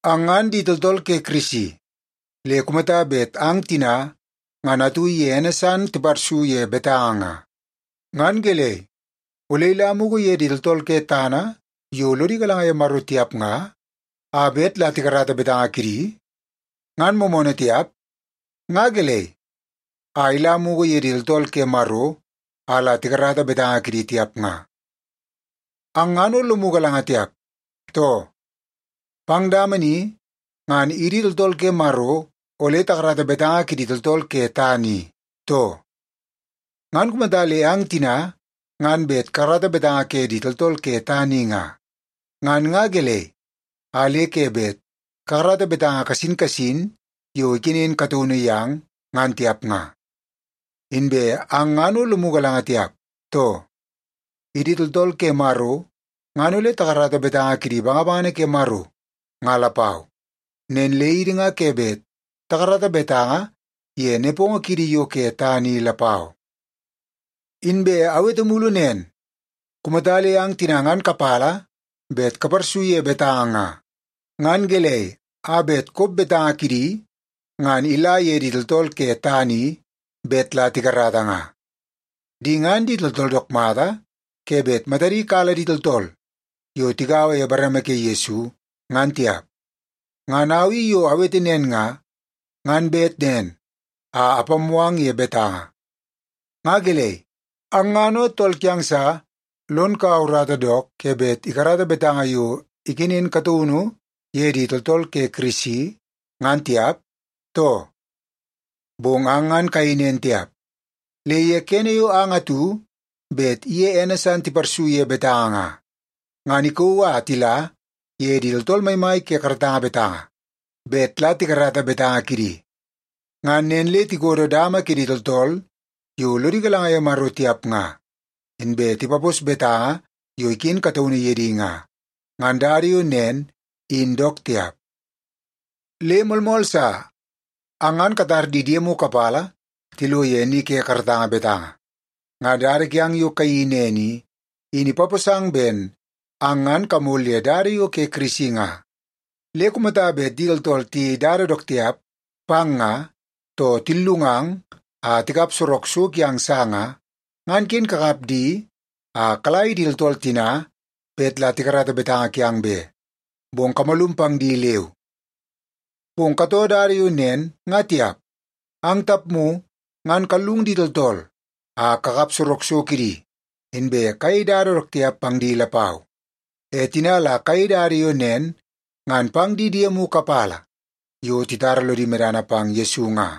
Ang ngan di tooltool ke Kirisi. Le kumata bet ang tina ngan atu iye ene san tiparsu ye betanga nga, ngan gelei, ole ila mugu ye di tooltool ke tana yo lodi galanga ye Maro tiap nga, a bet la tikarata betanga kidi? Ngan moomoonoo tiap? Nga gelei a ila mugu ye di tooltool ke Maro a la tikarata betanga kidi tiap nga? Ang ngan o lomu galanga tiap, too? Pang dama ni ngan idi tooltool ke Maro ole takarata betanga kidi tooltool ke tana i, too? Ngan kumata le ang tina ngan bet kakarata betanga ke di tooltool ke tana i nga, ngan nga gelei a le ke bet kakarata betanga kasin kasin yo ikenen kataunu yang, ngan tiap nga? Inbe ang ngan o lomu galanga tiap, too? Idi tooltool ke Maro ngan ole takarata betanga kidi bangabangana ke Maro, nga lapau. Nen le idi nga ke bet takarata betanga ye nepongo kiidi yo ke tana i lapau. Inbe awete mulu nen, kumata le ang tina ngan kapala bet kaparsu ye betanga nga, ngan gelei a bet kop betanga kidi ngan ila ye di tooltool ke tana i bet la tikarata nga? Di ngan di tooltool dook mata ke bet matadi kala di tooltool yo tigaua ye bareme ke Yesu ngan tiap! Ngan au i yo awete nen nga, ngan bet nen a apammoo ang ye betanga. Nga gelei, ang ngan o tool kiang sa lon kaua urata dook ke bet ikarata betanga yo ikenen kataunu ye di tooltool ke Kirisi, ngan tiap, too? Bong ang ngan kayei nen tiap. Le ye kene yo ang atu bet iye ene san tiparsu ye betanga nga, ngan ikauu a tila ye di tooltool maimai ke karatanga betanga bet la tikarata betanga kidi. Ngan nen le tikodo dama ke di tooltool yo lodi galanga ye Maro tiap nga, inbe tipapos betanga yo iken kataunu ye di nga. Ngan dada yo nen in dook tiap. Le moolmool sa, ang ngan katar di diemu kapala tilo ye ni ke karatanga betanga. Ngan dada kiang yo kayeii nen i, in ipaposang ben ang ngan kamol ye dada yo ke Kirisi nga. Le kumata bet di tooltool tiyei dada dook tiap pang nga, too tillungang a tikap sorok so kiang sa nga, ngan ken kakap di a kala ye di tooltool tina bet la tikarata betanga kiang be, bong kamalum pang di leu. Bong katoo dada yo nen nga tiap. Ang tapmu ngan kallung di tooltool a kakap sorok so kidi, inbe kayei dada dook tiap pang di lapau. E tina la kayei dada yo nen ngan pang di diemu kapala yo titara lodi medana pang Yesu nga.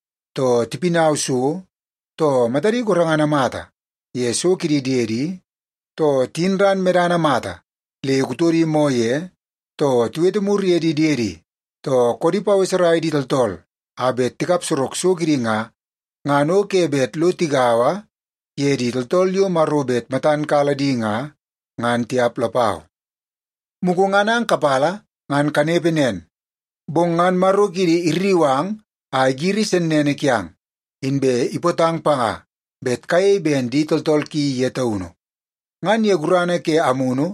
too tipinau so, too matadi gorengana mata ye so kidi diedi, too tiyin ran medana mata le kutodi moo ye, too tiwete mur ye di diedi, too koodi paweserai di tooltool a bet tikap sorok so kidi nga, ngan o ke bet lo tigaua ye di tooltool yo Maro bet matan kala di nga, ngan tiap lapau. Mugu ngan ang kapala ngan kanepe nen, bong ngan Maro kiidi irriu ang a igiri sennene kiang, inbe ipootang panga bet kayei ben di tooltool ki ye taunu. Ngan ye gurana ke Amunu,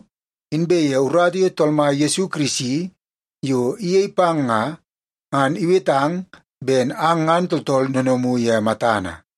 inbe ye urata ke Tool Mai Yesu Kirisi yo iyei pang nga, ngan iwetang ben ang ngan tooltool noonoomu ye matana.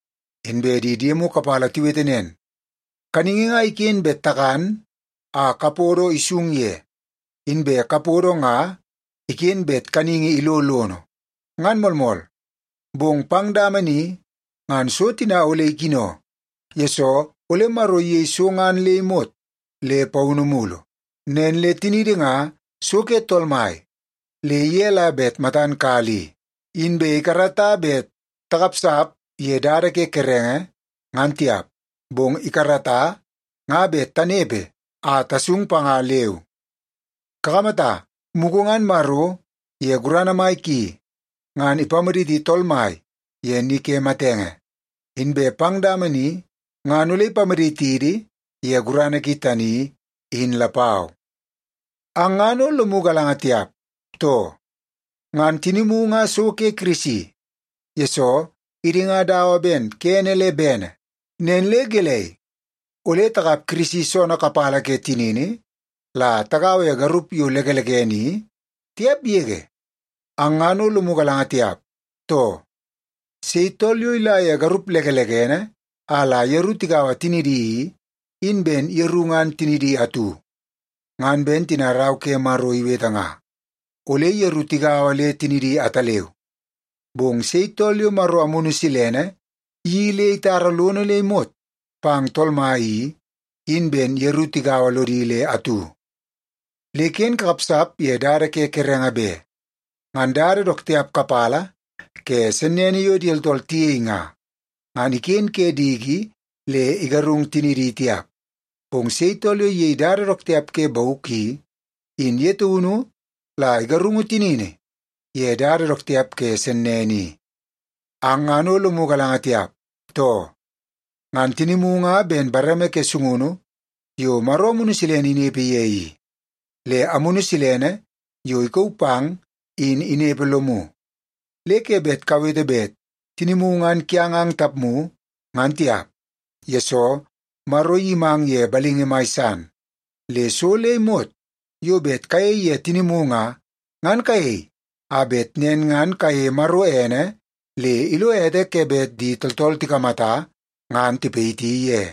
Inbe di diemu kapala tiwete nen, “Kaningi nga iken bet takan a kapodo isung ye, inbe kapodo nga iken bet kaningi ilo lono.” Ngan moolmool, bong pang dama ni ngan so tina ole ikino, yesoo ole Maro iyei so ngan le imot le paunu mulu. Nen le tiniidi nga so ke Tool Mai, le ye la bet matan kala i. Inbe ikarata bet takapsap ye dada ke kerenge, ngan tiap, bong ikarata nga bet tanepe a tasung panga, leu. Kakamata, mugu ngan Maro ye gurana mai ki, ngan ipamaditi Tool Mai ye ni ke matenge. Inbe pang dama ni ngan ole ipamaditidi ye gurana ki tani, in lapau. Ang ngan o lomu galanga tiap, too? Ngan tinimu nga so ke Kirisi, yesoo idi nga dawa ben kene le bene. Nen le gelei, ole takap Kirisi soonoo kapala ke tinini la tagaua ye garup yo lekelekene i? Tiap yege! Ang ngan o lomu galanga tiap, too? Sei tool yo ila ye garup lekelekene a la yeru tigaua tinidi i, in ben yeru ngan tinidi atu. Ngan ben tina Rau ke Maro iwete nga, “Ole yeru tigaua le tinidi ataleu.” Bong sei tool yo Maro Amunu Silene iyeii le itara lono le imot pang Tool Mai i, in ben yeru tigaua lodi le atu. Le ken kakapsap ye dada ke kerenge be. Ngan dada dook tiap kapala ke sennene yo di tooltool tiyei nga, ngan iken ke diki le igarung tinidi tiap. Bong sei tool yo iyei dada dook tiap ke bauk i, in ye taunu la igarungu tinini ye dada dook tiap ke sennene i. Ang ngan o lomu galanga tiap, too? Ngan tinimu nga ben bareme ke sungunu yo Maro Amunu Silene inepe ye i. Le Amunu Silene yo ikauu pang in inepe lomu. Le ke bet kawete bet tinimu ngan kiang ang tapmu, ngan tiap, yesoo Maro iyimang ye balingi mai san. Le so le imot yo bet kayei ye tinimu nga, ngan kayei a bet nen ngan kayeie Maro ene le ilo ete ke bet di tooltool tikamata ngan tipayiti ye.